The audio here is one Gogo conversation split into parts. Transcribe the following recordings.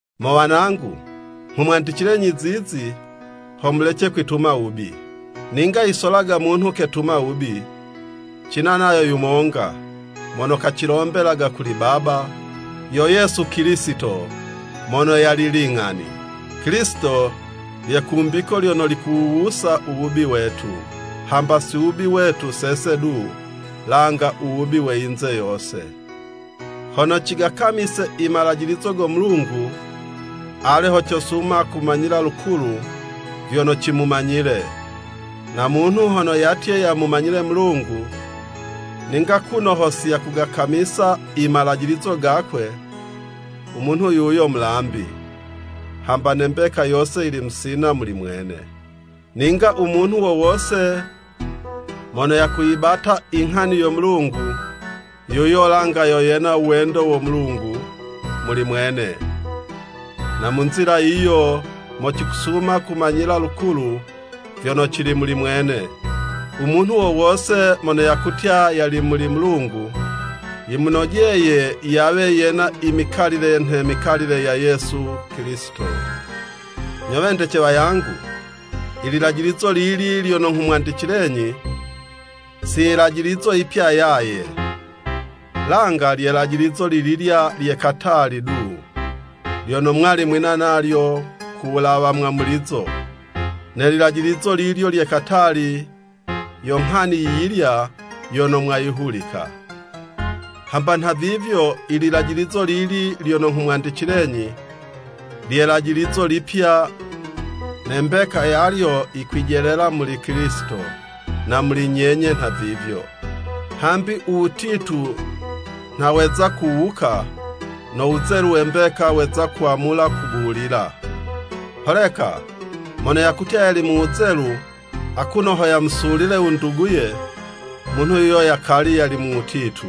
Mo wanangu nghumwandicilenyi zizi, ho mulece kwituma wubi. Ninga yisolaga munhu ketuma wubi, cina nayo yumonga mono kacilombelaga kuli Baba, yo Yesu Kilisito, mono yali ling'ani. Kilisito lye kumbiko lyono likuwuwusa u wubi wetu, hamba si wubi wetu sese du, langa u wubi we yinze yose. Hono cigakamise i malajilizo go Mulungu, ale ho cosuma kumanyila lukulu vyono cimumanyile. Na munhu hono yatye yamumanyile Mulungu, ninga kuno ho siyakugakamisa i malajilizo gakwe, u munhu yuyo mulambi, hamba ne mbeka yose yili musina muli mwene. Ninga u munhu wo wose mono yakuyibate i nghani yo Mulungu, yuyo langa yo yena u wendo wo Mulungu muli mwene. Na mu nzila yiyo mo cikusuma kumanyila lukulu vyono cili muli mwene, u munhu wo wose mono yakutya yali muli Mulungu, yimunojeye yawe yena i mikalile, nhe mikalile ya Yesu Kilisito. Nyo wendece wangu, i lilajilizo lili lyono nghumwandicilenyi, si yilajilizo yipya yaye, langa lye lajilizo lililya lye katali du, lyono mwali mwina nalyo ku wulawa mwamulizo. Ne lilajilizo lilyo lye katali, yo nghani yi yilya yono mwayihulika. Hamba nhavivyo i lilajilizo lili lyono nghumwandicilenyi, lye 'lajilizo lipya, ne mbeka yalyo, yikwijelela muli Kilisito na muli nyenye nhavivyo. Hambi u wutitu nha weza kuwuka, no wuzelu we mbeka weza kwamula kubulila. Holeka mono yakutya yali mu wuzelu, akuno ho yamusulile u nduguye, munhu yuyo yakali yali mu wutitu.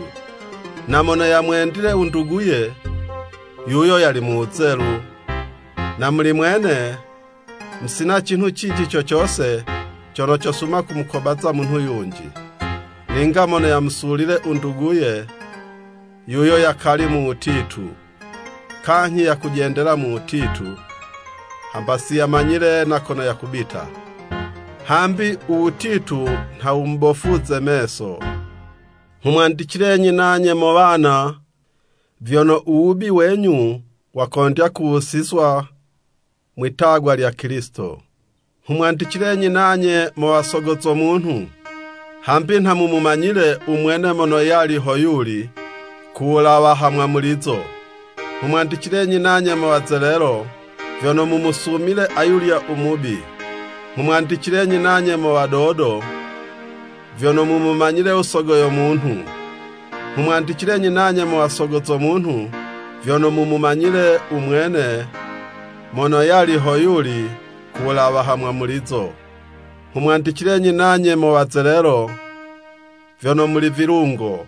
Na mono yamwendile u nduguye, yuyo yali mu wuzelu, na muli mwene musina cinhu cinji co cose cono cosuma kumukobaza munhu yunji. Ninga mono yamusulile u nduguye, yuyo yakali mu wutitu, kanyhi yakujendela mu wutitu, hamba siyamanyile na kono yakubita, hambi u wutitu nha wumubofuze i meso. Nghumwandicilenyi nanye mo wana, vyono u wubi wenyu wakondya kuwusizwa mwitagwa lya Kilisito. Nghumwandicilenyi nanye mo wasogo za munhu, hambi nha mumumanyile u mwene mono yali ho yuli, ku wulawa ha mwamulizo. Nghumwandicilenyi nanye mo wazelelo, vyono mumusumile ayulya u mubi. Nghumwandicilenyi nanye mo wadodo, vyono mumumanyile u Sogo yo munhu. Nghumwandicilenyi nanye mo wa sogo zo munhu, vyono mumumanyile u mwene mono yali ho yuli ku wulawa ha mwamulizo. Nghumwandicilenyi nanye mo wazelelo, vyono muli vilungo,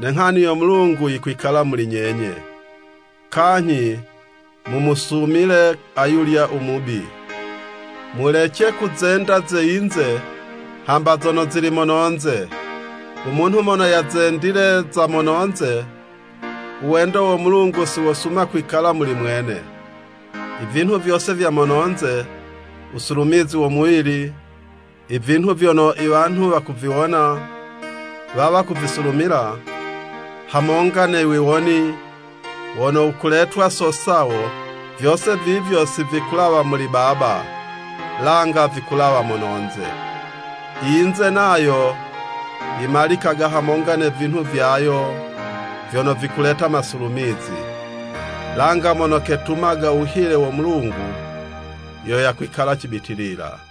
ne nghani yo Mulungu yikwikala muli nyenye, kanyhi mumusumile ayulya u Mubi. Mulece kuzenda ze yinze, hamba zono zili mononze. U munhu mono yazendile za mononze, u wendo wo Mulungu siwosuma kwikala muli mwene. I vinhu vyose vya mononze, wusulumizi wo muwili, i vinhu vyono i wanhu wakuviwona, wawa kuvisulumila, hamonga no wiwoni wono wukuletwa so sawo, vyose vivyo sivikulawa muli Baba, langa vikulawa mononze. I yinze nayo yimalikaga hamonga ne vinhu vyayo vyono vikuleta masulumizi, langa mono ketumaga u wuhile wo Mulungu, yo yakwikala cibitilila.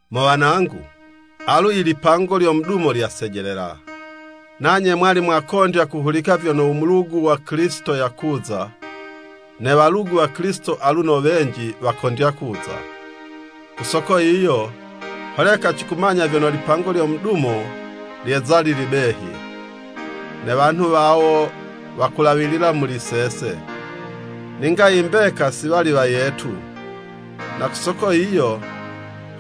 Mo wanangu, alu ilipango lyo mudumo lyasejelela! Nanye mwali mwakondya kuhulika vyono u mulugu wa Kilisito yakuza, ne walugu wa Kilisito aluno wenji wakondya kuza, ku soko yiyo, holeka cikumanya vyono lipango lyo mudumo lyeza lili behi. Ne wanhu wawo wakulawilila muli sese, ninga i mbeka, si wali wayetu, na ku soko yiyo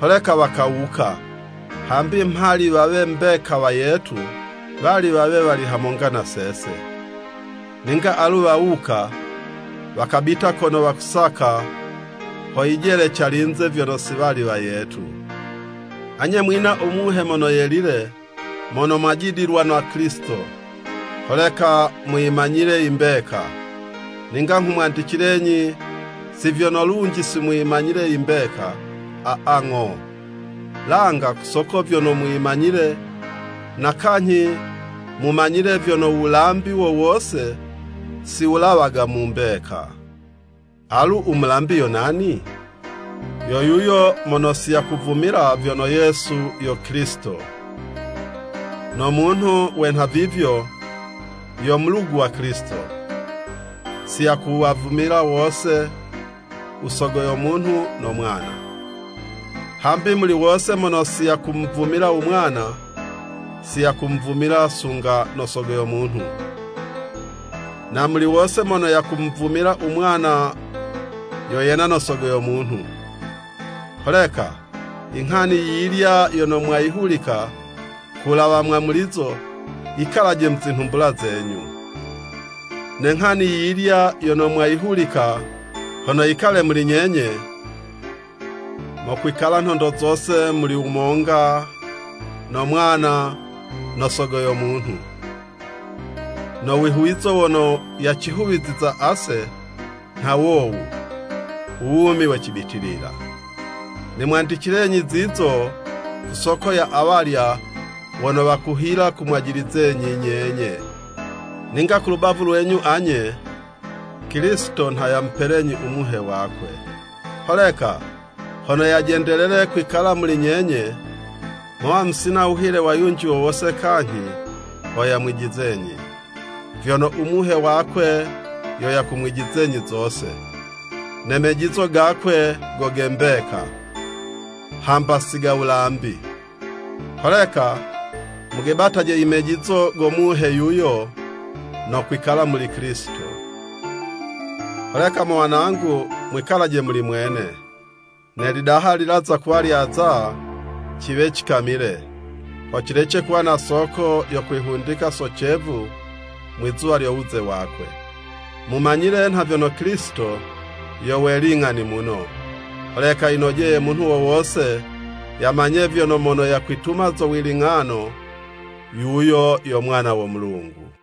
holeka wakawuka, hambi mhali wawe mbeka wayetu, wali wawe wali hamonga na sese. Ninga alu wawuka, wakabita kono wakusaka, ho yijele calinze vyono si wali wayetu. Anye mwina u Muhe Mono Yelile mono mwajidilwa na Kilisito, holeka muyimanyile i mbeka. Ninga nghumwandicilenyi si vyono lunji simuyimanyile i mbeka, aa, ng'o, langa ku soko vyono muyimanyile, na kanyhi mumanyile vyono wulambi wo wose siwulawaga mu mbeka. Alu u mulambi yo nani? Yo yuyo mono si yakuvumila vyono Yesu yo Kilisito. No munhu we nhavivyo, yo mulugu wa Kilisito, si yakuwavumila wose, u Sogo yo munhu no Mwana. Hambi muli wose mono si yakumuvumila u Mwana, siyakumuvumila sunga no Sogo yo munhu, na muli wose mono yakumuvumila u Mwana, yo yena no Sogo yo Munhu. Holeka i nghani yiyilya yono mwayihulika ku wulawa mwamulizo, yikalaje mu zinhumbula zenyu. Ne nghani yiyilya yono mwayihulika, hono yikale muli nyenye, mokwikala nhondo zose muli mu wumonga no Mwana no Sogo yo Munhu. No wihuwizo wono yacihuwiziza ase, nha wowu, u wumi we cibitilila. Nimwandicilenyi zi zino ku soko ya awalya wono wakuhila kumwajilizenyi nyenye. Ninga ku lubavu lwenyu anye, Kilisito nha yamupelenyi u Muhe wakwe. Holeka hono yajendelele kwikala muli nyenye, mowa musina wuhile wa yunji wo wose kanyhi ho yamwijizenyi. Vyono u Muhe wakwe yo yakumwijizenyi zose, ne mejizo gakwe go ge mbeka, hamba si ga wulambi. Holeka mugebataje i mejizo go Muhe yuyo no kwikala muli Kilisito. Holeka mo wanangu mwikalaje muli mwene, ne lidaha lilaza kuwa lyaza, ciwe cikamile, ho cilece kuwa na soko yo kwihundika so cevu, mwizuwa lyo wuze wakwe. Mumanyile nha vyono Kilisito yo we ling'ani muno, holeka yinojeye munhu wo wose yamanye vyono mono yakwituma zo wiling'ano, yuyo yo mwana wo Mulungu.